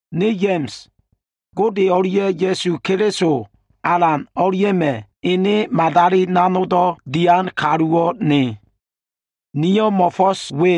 Ne Ya꞉ma꞉s, Gode o꞉lia꞉ Ya꞉su Keliso Alan o꞉lia꞉ma꞉ ene madali nanogdo꞉ dian kaluwo꞉ ne. Niyo꞉ mo꞉fo꞉s we,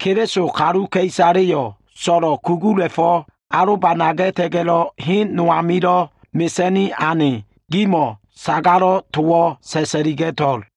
Keliso kaluka꞉isaleyo꞉ so꞉lo꞉ kugula꞉fo꞉ alobanaga꞉ta꞉ga꞉lo꞉ hen no amilo꞉ mesa꞉ni ane gimo꞉wo꞉ sagalo꞉ towo꞉ sa꞉sa꞉liga꞉to꞉l.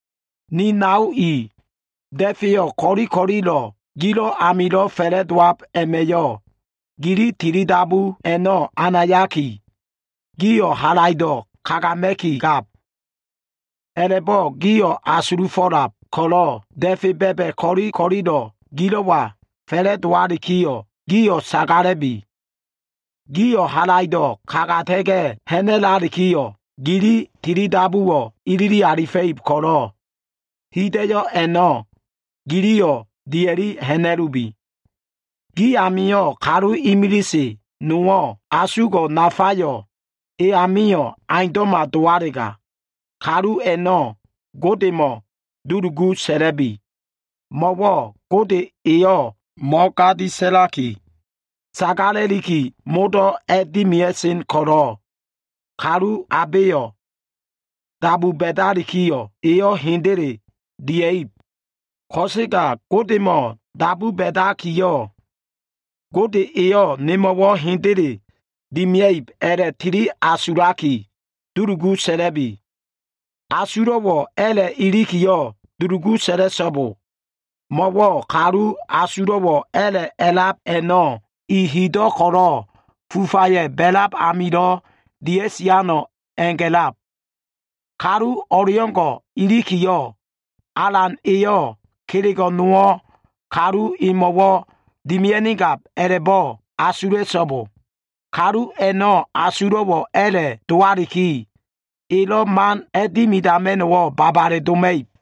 Ni nao i, da꞉feyo꞉ ko꞉li ko꞉lilo꞉ ko꞉lo꞉ gilo꞉ amilo꞉ fa꞉la꞉dowab a꞉ma꞉yo꞉, gili tilidabu a꞉no꞉ anayaki, gio꞉ halaido꞉ kagama꞉kigab. A꞉la꞉bo꞉ gio꞉ asulufo꞉lab ko꞉lo꞉, da꞉fe ba꞉ba꞉ ko꞉li ko꞉lilo꞉ gilo꞉wa fa꞉la꞉dowalikiyo꞉, gio꞉ sagala꞉bi. Gio꞉ halaido꞉ kagata꞉ga꞉ ha꞉na꞉lalikiyo꞉, gili tilidabuwo꞉ ilili alifa꞉ib ko꞉lo꞉, hida꞉yo꞉ a꞉no꞉ giliyo꞉ dia꞉li ha꞉na꞉lubi. Gi amio꞉ kalu imilise nowo꞉ asugo꞉ nafayo꞉ e amio꞉ aundo꞉ma dowalega, kalu a꞉no꞉ Godemo꞉ dulugu sa꞉la꞉bi. Mo꞉wo꞉ Gode Eyo꞉ mo꞉gadi sa꞉laki, sagala꞉liki modo꞉ a꞉dimia꞉sen ko꞉lo꞉, kalu abeyo꞉ dabu ba꞉dalikiyo꞉, eyo꞉ hendele dia꞉ib. Ko꞉sega Godemo꞉ dabu ba꞉dakiyo꞉, Gode eyo꞉ nemo꞉wo꞉ hendele dimia꞉ib a꞉la꞉tili asulaki dulugu sa꞉la꞉bi. Asulo꞉wo꞉ a꞉la꞉ ilikiyo꞉, dulugu sa꞉la꞉so꞉bo. Mo꞉wo꞉ kalu asulo꞉wo꞉ a꞉la꞉ a꞉lab a꞉no꞉, i hido꞉ ko꞉lo꞉ fufaya꞉ ba꞉lab amilo꞉ dia꞉siano꞉ a꞉ga꞉lab. Kalu o꞉leo꞉ngo꞉ ilikiyo꞉, Alan Eyo꞉ kelego꞉ nowo꞉ kalu emo꞉wo꞉ dimia꞉nigab a꞉la꞉bo꞉ asula꞉so꞉bo. Kalu a꞉no꞉ asulo꞉wo꞉ a꞉la꞉ dowakiyo꞉, elo꞉ man a꞉dimidama꞉no꞉wo꞉ babale doma꞉ib.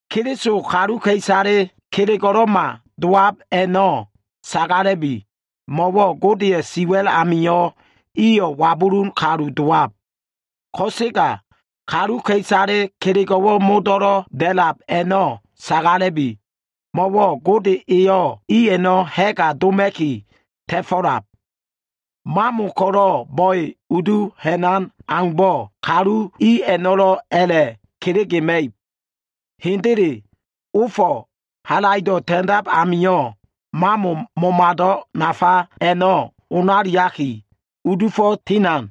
Keliso kaluka꞉isale kelego꞉lo꞉ma dowab a꞉no꞉ sagala꞉bi, mo꞉wo꞉ Godeya꞉ siwa꞉l amio꞉ iyo꞉ wabulun kaluka꞉isale dowab. Ko꞉sega kaluka꞉isale kelego꞉wo꞉ modo꞉lo꞉ da꞉lab a꞉no꞉ sagala꞉bi, mo꞉wo꞉ Gode eyo꞉ i a꞉no꞉ ha꞉ga doma꞉ki ta꞉fo꞉lab. Mamo ko꞉lo꞉ bo꞉e udu ha꞉nan aumbo꞉, kaluka꞉isale i a꞉no꞉lo꞉ a꞉la꞉ kelegema꞉ib. Hendele, ofo꞉ halaido꞉ ta꞉ndab amio꞉, mamo momado꞉ nafa a꞉no꞉ onaliaki, udufo꞉ tinan.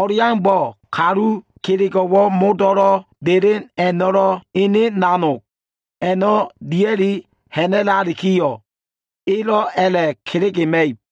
O꞉leaumbo꞉, kaluka꞉isale kelego꞉wo꞉ modo꞉lo꞉ delen a꞉no꞉lo꞉, ene nanog a꞉no꞉ dia꞉li ha꞉na꞉lalikiyo꞉, elo꞉ a꞉la꞉ kelegema꞉ib.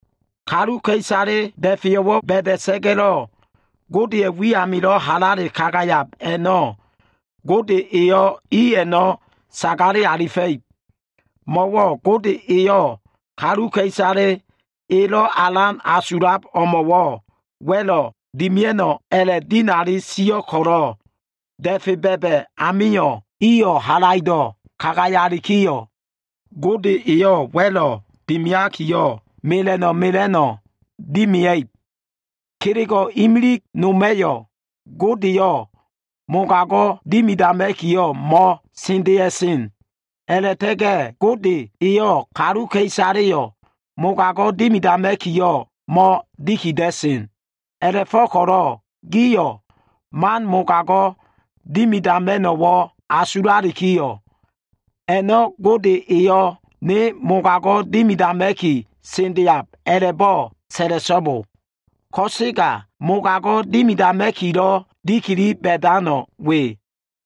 Kaluka꞉isale da꞉feyo꞉wo꞉ ba꞉da꞉sa꞉ga꞉lo꞉, Godeya꞉ wi amilo꞉ halale kagayab a꞉no꞉, Gode eyo꞉ i a꞉no꞉ sagale alifa꞉ib. Mo꞉wo꞉ Gode eyo꞉ kaluka꞉isale elo꞉ alan asulab o꞉mo꞉wo꞉ wa꞉lo꞉ dimia꞉no꞉ a꞉la꞉dinali sio꞉ ko꞉lo꞉, da꞉fe ba꞉ba꞉ amio꞉ iyo꞉ halaido꞉ kagayalikiyo꞉, Gode eyo꞉ wa꞉lo꞉ dimiakiyo꞉, mela꞉no꞉ mela꞉no꞉ dimia꞉ib. Kelego꞉ imilig noma꞉yo꞉ Godeyo꞉ mogago꞉ dimidama꞉kiyo꞉ mo꞉sendea꞉sen. A꞉la꞉ta꞉ga꞉ Gode eyo꞉ kaluka꞉isaleyo꞉ mogago꞉ dimidama꞉kiyo꞉, mo꞉dikida꞉sen. A꞉la꞉fo꞉ko꞉lo꞉ gio꞉ man mogago꞉ dimidama꞉no꞉wo꞉ asulalikiyo꞉, “A꞉no꞉ Gode eyo꞉ ne mogago꞉wo꞉ dimidama꞉ki sendeab” a꞉la꞉bo꞉ sa꞉la꞉so꞉bo. Ko꞉sega mogago꞉ dimidama꞉kilo꞉ dikili ba꞉dano꞉ we.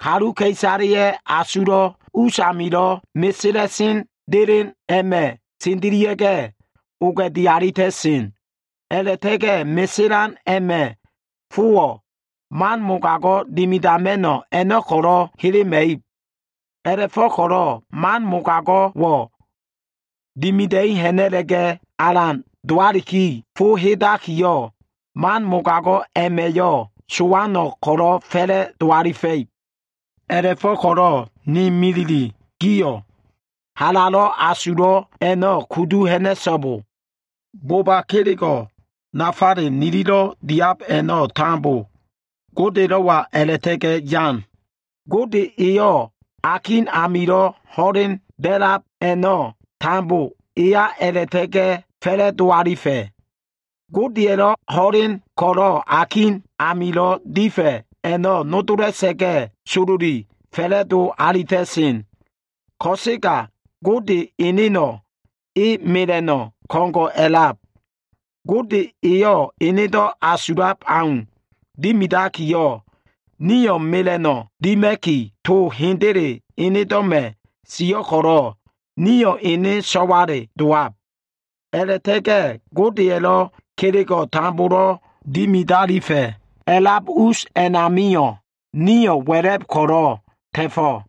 Kaluka꞉isaleya꞉ asulo꞉ us amilo꞉ meselan delen a꞉ma꞉ sendelia꞉ga꞉ oga꞉di alita꞉sen. A꞉la꞉ta꞉ga꞉ meselan a꞉ma꞉ fowo꞉, man mogago꞉ dimidama꞉no꞉ a꞉no꞉ ko꞉lo꞉ helema꞉ib. A꞉la꞉fo꞉ko꞉lo꞉ man mogago꞉wo꞉ dimida꞉i ha꞉na꞉la꞉ga꞉ alan dowaliki fo hedakiyo꞉, man mogago꞉ a꞉ma꞉yo꞉ sowano꞉ ko꞉lo꞉ fa꞉la꞉do alifa꞉ib. A꞉la꞉fo꞉ko꞉lo꞉ ni milile, gio꞉ halalo꞉ asulo꞉ a꞉no꞉ kudu ha꞉na꞉so꞉bo. Boba kelego꞉ nafale nilido꞉ diab a꞉no꞉ tambo Godelo꞉wa a꞉la꞉ta꞉ga꞉ yan. Gode eyo꞉ akin amilo꞉ ho꞉len da꞉lab a꞉no꞉ tambo eya a꞉la꞉ta꞉ga꞉ fa꞉la꞉do alifa꞉. Akin amilo꞉ ho꞉len a꞉lab a꞉no꞉ nodola꞉sa꞉ga꞉, sololi fa꞉la꞉dowa꞉sen. Ko꞉sega Gode eneno꞉ e mela꞉no꞉ ko꞉ngo꞉ a꞉lab. Gode eyo꞉ enedo꞉ asulab au dimidakiyo꞉, nio꞉ mela꞉no꞉wo꞉ dima꞉ki, to hendele enedo꞉ma꞉ sio꞉ ko꞉lo꞉, nio꞉ ene so꞉wale dowab. A꞉la꞉ta꞉ga꞉ Godeya꞉lo꞉ kelego꞉ tambolo꞉ dimidalifa꞉ a꞉lab us a꞉namio꞉, nio꞉ wa꞉la꞉b ko꞉lo꞉ ta꞉fo꞉.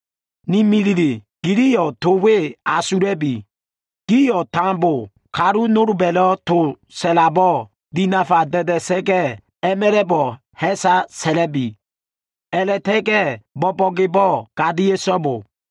Ni milile, giliyo꞉ to we asula꞉bi. Gio꞉ tambo kalu nolba꞉lo꞉ to sa꞉labo꞉ dinafa da꞉da꞉sa꞉ga꞉, a꞉ma꞉la꞉bo꞉ ha꞉sa sa꞉la꞉bi. A꞉la꞉ta꞉ga꞉ bo꞉bo꞉gebo꞉ gadia꞉so꞉bo.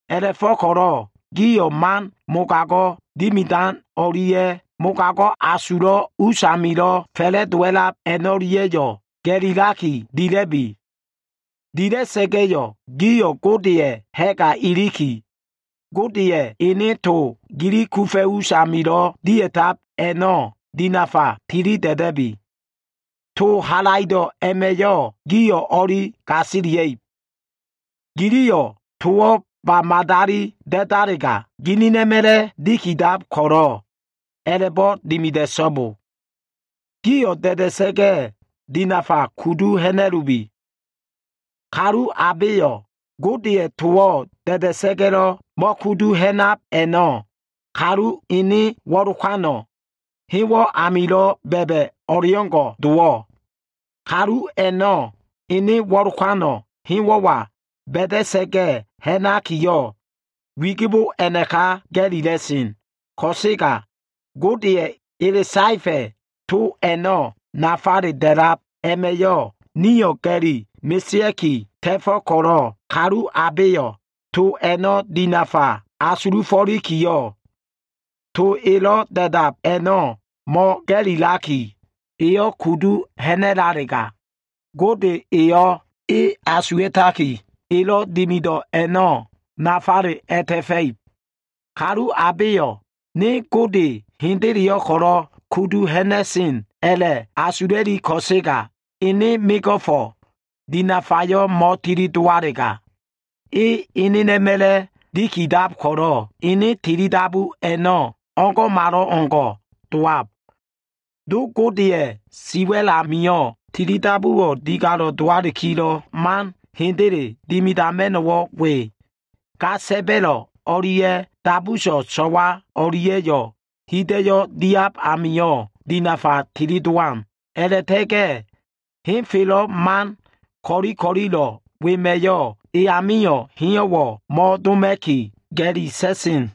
A꞉la꞉fo꞉ko꞉lo꞉ gio꞉ man mogago꞉ dimidan o꞉lia꞉ mogago꞉ asulo꞉ usamilo꞉ fa꞉la꞉dowa꞉lab a꞉no꞉lia꞉yo꞉ ga꞉lilaki dila꞉bi. Dila꞉sa꞉ga꞉yo꞉ gio꞉ Godeya꞉ ha꞉ga iliki, Godeya꞉ ene to gili kufa꞉ usamilo꞉ dia꞉tab a꞉no꞉ dinafa tilida꞉da꞉bi. To halaido꞉ a꞉ma꞉yo꞉ gio꞉ o꞉li gasilia꞉ib. Giliyo꞉ towo꞉ ba madali da꞉dalega, ginin a꞉ma꞉la꞉ dikidab ko꞉lo꞉ a꞉la꞉bo꞉ dimida꞉so꞉bo. Gio꞉ da꞉da꞉sa꞉ga꞉, dinafa kudu ha꞉na꞉lubi. Kalu abeyo꞉ Godeya꞉ towo꞉ da꞉da꞉sa꞉ga꞉lo꞉ mo꞉kudu ha꞉nab a꞉no꞉, kalu ene wo꞉lokano꞉ hewo꞉ amilo꞉ ba꞉ba꞉ o꞉leo꞉ngo꞉ dowab. Kalu a꞉no꞉ ene wo꞉lokano꞉ hewo꞉wa ba꞉da꞉sa꞉ga꞉ ha꞉nakiyo꞉, wigibo a꞉naka ga꞉lila꞉sen. Ko꞉sega Godeya꞉ ele saefa꞉ to a꞉no꞉ nafale da꞉lab a꞉ma꞉yo꞉ nio꞉ ga꞉li mesea꞉ki ta꞉fo꞉ ko꞉lo꞉, kalu abeyo꞉ to a꞉no꞉ dinafa asulufo꞉likiyo꞉, to elo꞉ da꞉dab a꞉no꞉ mo꞉ga꞉lilaki, eyo꞉ kudu ha꞉na꞉lalega, Gode eyo꞉ e asuwa꞉taki, elo꞉ dimido꞉ a꞉no꞉ nafale a꞉ta꞉fa꞉ib. Kalu abeyo꞉ “Ne Gode hendeleyo꞉ ko꞉lo꞉ kudu ha꞉na꞉sen” a꞉la꞉asula꞉li ko꞉sega, ene mego꞉fo꞉ dinafayo꞉ mo꞉tili dowalega, e enena꞉ma꞉la꞉ dikidab ko꞉lo꞉ ene tilidabu a꞉no꞉ o꞉ngo꞉malo꞉ngo꞉ dowab. Do Godeya꞉ siwa꞉l amio꞉, tilidabuwo꞉ digalo꞉ dowakilo꞉ man hendele dimidama꞉no꞉wo꞉ we. Ga sa꞉ba꞉lo꞉ o꞉lia꞉ dabuso꞉ so꞉wa o꞉lia꞉yo꞉ hida꞉yo꞉ diab amio꞉ dinafa tilidowan. A꞉la꞉ta꞉ga꞉ henfelo꞉ man ko꞉li ko꞉lilo꞉ wema꞉yo꞉ eyamio꞉ heyo꞉wo꞉ mo꞉doma꞉ki, ga꞉li sa꞉sen.